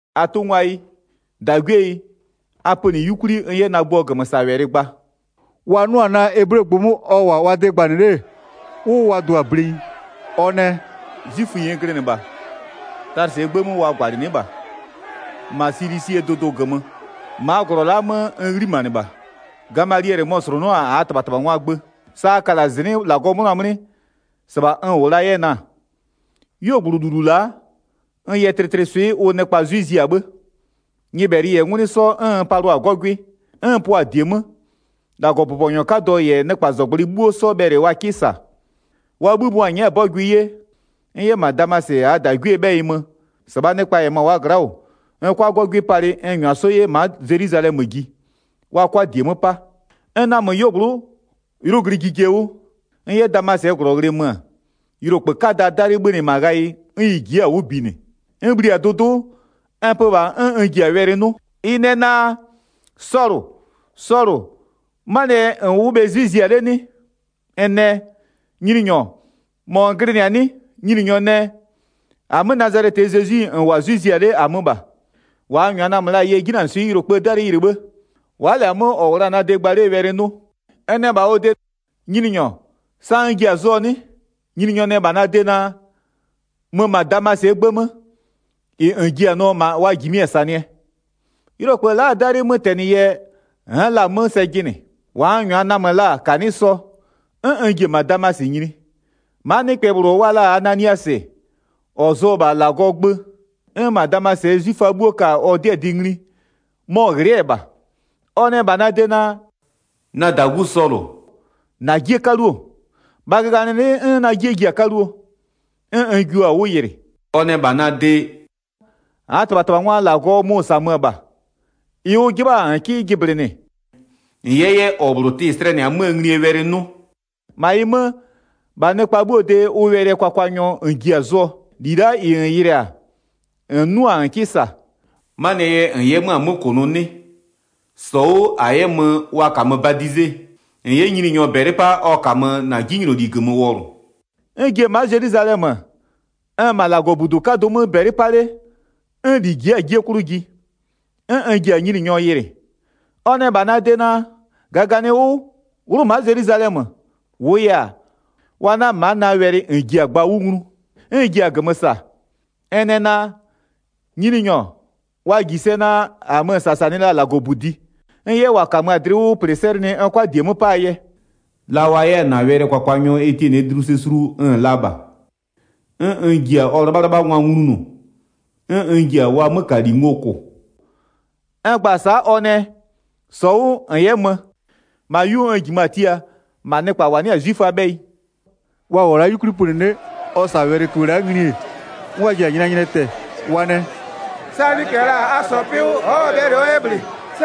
“-Atʋngwayi, -dagwieyi, a pönɩ 'yukwli n 'yɛ na gbʋɔ -gömösawɛlɩ gba.” Wa 'nʋ-a naa eblegbʋ 'mö ɔ -wʋ-a wa de gbanɩ 'le-e, 'wʋ wa dʋ-a blenyi. Ɔ nɛ: “'Zwiföyi n glɩnɩ -bha Talɩsɩɛ 'gbë 'mö wa -gwalɩnɩ'ɩ -bha, -ma Silisie dʋdʋ -gömö. Ma'a -glɔ la'a 'mö n 'ghlimanɩ -bha. Gamaliɛlɩ mɔ-ɔ -slʋnʋ'ʋ-a -aa -tɩbhatɩbhangwaa gbö. Sa a ka -la -zɩnɩ'ɩ -Lagɔɔ 'mʋna 'mlɩ, -sɩbha n -wʋ la 'yɛ na-a. 'Yuogblʋ -lulu la'a, n yɛ tlɩtlɩswɩ'ɩ ʋ nɩkpa 'zwɩ zia 'bhë. Nyɩbhɛlɩ -yɛ 'ngwlɩ 'sɔ 'n n palʋa-a 'gɔgwɩ, 'n n pʋa-a -die 'mö. 5-Lagɔbʋbɔnyɔ 'kadɔ -yɛ nɩkpazɔgblʋɩ 'bhuo 'sɔ bhɛlɩ wa 'kɩ -sa. Wa 'bhï mʋa-a nyɛ'ɛ-a 'bɔgʋɩ 'ye, n 'yɛ -ma Damasɩ -aa -dagwiee 'bhɛyɩ mö, -sɩbhaa nɩkpa -yɛ -ma wa gla'a -wʋ, n 'kʋa 'gɔgwɩ palɩ n -nyʋa 'sɔ 'yɛ ma'a Zelwizalɛmö ji, wa 'kʋa -die 'mö 'pa. N namö 'yuogblʋ'ʋ 'ylʋ glɩ jije 'wʋ, n 'yɛ Damasɩɛ -glɔ ghlɩɛ mö-ö, yʋlokpë 'kadaa 'dalɩ 'bhönɩ -ma ghayɩ 'n ɩ ji'i-a 'wʋ binɩ. N bhli-a dʋdʋ'ʋ, n pö -bha 'n n ji-a wɛlɩ 'nʋ, ɩ nɛ naa: Sɔlʋ, Sɔlʋ, 'manɩɛ yɛ -n wʋ'ʋ bhe 'zwɩ zia 'le 'nɩ? N nɛ: Nyininyɔ, -mɔ n glɩnɩ-a 'nɩ? Nyininyɔ nɛ: -Amö Nazalɛtɩɛ Zezwi-i -n -wʋ-a 'zwɩ zia 'le -amö -bha. 9-Wa n -nyʋa namö la-a yɛ 'jinanɩswɩ'ɩ yʋlokpëë 'dalɩ yɩlɩ 'bhë, wa'a -lɛ-a 'mö -ɔ -wʋ la-a na de gba 'lee wɛlɩ 'nʋ. N nɛ -bha ɔ de: Nyininyɔ, sa n ji-a zʋɔ 'nɩ? Nyininyɔ nɛ -bha na de naa: Mö -ma Damasɩɛ 'gbë 'mö, -ɩ -n ji-a nʋɔ -ma wa -jimɩ-a -sanɩɛ. Yʋlokpë la'aa 'dalɩɛ 'mötɛnɩ yɛ n'n la-a 'mö sɛ jɩnɩ. -Wa n -nyʋa namö la-a -kanɩ'ɩ sɔ, 'n n ji-e -ma Damasɩ nyini. 12-Maa nɩkpɛ -bhlʋ wa la-a Ananiasɩ, -ɔ zʋ-ɔ -bha -Lagɔɔ gbö, 'n -ma Damasɩɛ 'zwiföa 'bhuo ka-a ɔ 'dɩɛ dɩ ngli, mɔ-ɔ ghlɩ'ɩ-ɛ -bha, ɔ nɛ -bha na de naa: Na -dagu Sɔlʋ, -na 'jie 'kaluo. -Bha -gaganɩlɩ'ɩ, 'n na 'jie ji-a 'kaluo, 'n n jio-a 'wʋ yɩlɩ. Ɔ nɛ -bha na de: -Aa -tɩbhatɩbhangwaa -Lagɔ mʋ-ʋ -samö-ö -bha, -ɩ ʋ 'jɩbha-a -n 'kɩ jɩblɩnɩ, -n 'yɛ 'yɛ -ɔ -bhlʋ tɩ slɛnɩ-a 'möö nglie wɛlɩ 'nʋ. 15-Ma -ɩ 'mö, -bha nɩkpa 'bhuo de ʋ wɛlɩɛ kwakwanyɔ -n ji-a zʋɔ -li la'a -ɩ -n yɩlɩ-a, -n 'nʋ-a -n 'kɩ -sa. 'Manɩɛ yɛ -n 'yɛ-a 'mö-a 'mö -kʋnʋ 'nɩ? -Sɔ 'wʋ -a 'yɛ mö wa -kamö badize, -n 'yɛ Nyininyɔ -bɛlɩ 'pa ɔ -kamö -na 'jinyloli -gömö wɔlʋ. N ji-e ma'a Zelwizalɛmö, n-n -ma -Lagɔbudu 'kadʋ 'mö -bɛlɩ 'pa 'le, 'n -li ji'i-a 'jie 'klʋ ji. 'N n ji-a Nyininyɔ yɩlɩ. Ɔ nɛ -bha na de naa: -Gaganɩ 'wʋ, 'wlʋ ma'a Zelwizalɛmö, -wʋʋ yɛ-a, wa 'na ma'a na wɛlɩ -n ji-a gba 'wʋ nglu. 'N n ji-a -gömö -sa, n nɛ naa: Nyininyɔ, wa -ji sɛ naa, -amö-ö -sasanɩ la-a -Lagɔbudi, n 'yɛ -wa -kamö-a dlɩ 'wʋ -plɩ 'sɛlɩnɩ n 'kʋa -die 'mö 'paa yɛ. La wa 'yɛ-a -na wɛlɩɛ kwakwanyɔ Etiɛnɩɛ dlu sɛ sulu n-n la -bha, 'n n ji-a ɔ 'lɩbhalɩbhangwa nglunʋ, 'n n ji-a wa 'mökali ngo -kʋ. N gba-a sa'a, ɔ nɛ: -Sɔ 'wʋ -n 'yɛ mö, -ma 'yu n -jimö-a tia -ma nɩkpa -wa 'nɩ-a 'zwiföaa 'bhɛyɩ.” Wa -wʋɔ la 'yukwli pönɩ 'le, ɔ -sa-a wɛlɩköbhë la'a ngli-e, 'n wa ji-a nyɩnanyɩnɩɛ tɛ-ɛ. Wa nɛ: “-Saa nɩkpɛ -la a -sɔɔ 'pɩ 'wʋ, ɔ'ɔ bhɛlɩ ɔ 'yɛ -bhlɩ!”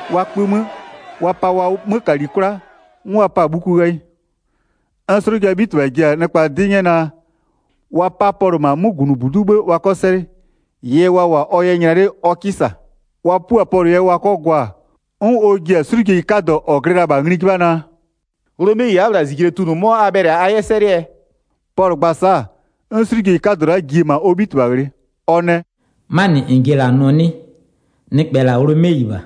Wa kpö 'mö, wa pa wa 'mökali 'kwla, 'n wa 'pa-a bhuku ghayɩ. 'N 'slʋjaa 'bhitɩbha ji-a nɩkpa 'dɩ 'nyɛ naa, wa 'pa Pɔlʋ -ma 'mögunʋbudu'u 'bhë wa 'kɔ 'sɛlɩ, -ɩɩ yɛ wa -wʋ-a ɔ yɛ nyla 'le ɔ 'kɩ -sa. Wa 'pua-a Pɔlʋ yɛ wa 'kɔ gwa-a, 'n ɔ ji-a 'slʋjeyi 'kadɔ -ɔ glɩ la-a -bha ngli 'jɩbha naa: “Ghlomeyi wa'a-a -bhla -zijle tunʋ, 'mɔ a bhɛlɩ-a a 'yɛ 'sɛlɩɛ?” Pɔlʋ gba-a sa'a, 'n 'slʋjeyi 'kadɔ la'a ji-e -ma ɔ 'bhitɩbha ghlɩ. Ɔ nɛ “'Manɩ -n ji-e -la nʋɔ 'nɩ? Nɩkpɛ -la Ghlomeyi -bha.”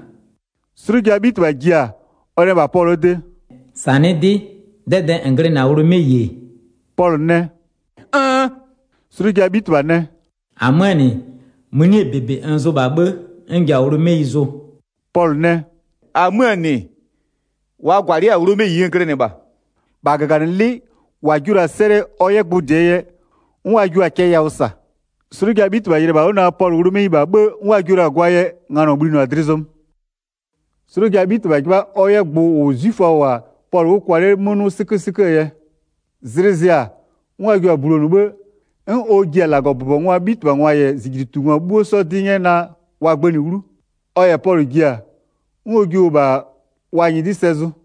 'Slʋjaa 'bhitɩbha ji-a, ɔ nɛ -bha Pɔlʋɔ de: “-Sanɩ'ɩ 'dɩ, 'dɛdɛɛ -n glɩnɩ-a Ghlomeyi-e?” Pɔlʋ nɛ: “Nn.” 'Slʋjaa 'bhitɩbha nɛ: “-Amöö -nɩ, mënie -bebe n zʋ -bha 'bhë 'n n ji-a Ghlomeyi zʋ.” Pɔlʋ nɛ: “-Amöö -nɩ, wa -gwalɩ'ɩ-a Ghlomeyi n glɩnɩ -bha.” 29-Bha -gaganɩlɩ'ɩ -wa jio la-a 'sɛlɩɛ ɔ 'yɛ gbʋ -dɩɛ yɛ, 'n wa jio-a cɛ yawʋ -sa. 'Slʋjaa 'bhitɩbha yɩlɩ-ɛ -bha 'wʋ naa, Pɔlʋ Ghlomeyi -bha 'bhë 'n wa jio la-a gwaa yɛ nganɔ bhlinɩɔ-a dlɩ zɔmö. 'Slʋjaa 'bhitɩbha 'jɩbha ɔ 'yɛ gbʋ -ʋ 'zwiföa -wʋ-a Pɔlʋ 'wʋ kwa 'le 'mö 'nʋ 'sɩkösɩköö yɛ, zlɩ zɩ-a, 'n wa jio-a bulonʋ, 'bhë, 'n ɔ ji-a -Lagɔbʋbɔngwaa 'bhitɩbhangwa -yɛ -zijlitungwa 'bhuo 'sɔ 'dɩ 'nyɛ naa, wa gbënɩ 'wlu. Ɔ -yɛ Pɔlʋ ji-a, 'n ɔ jio-o -bha wa nyɩdɩ'ɩ sɛ zʋ.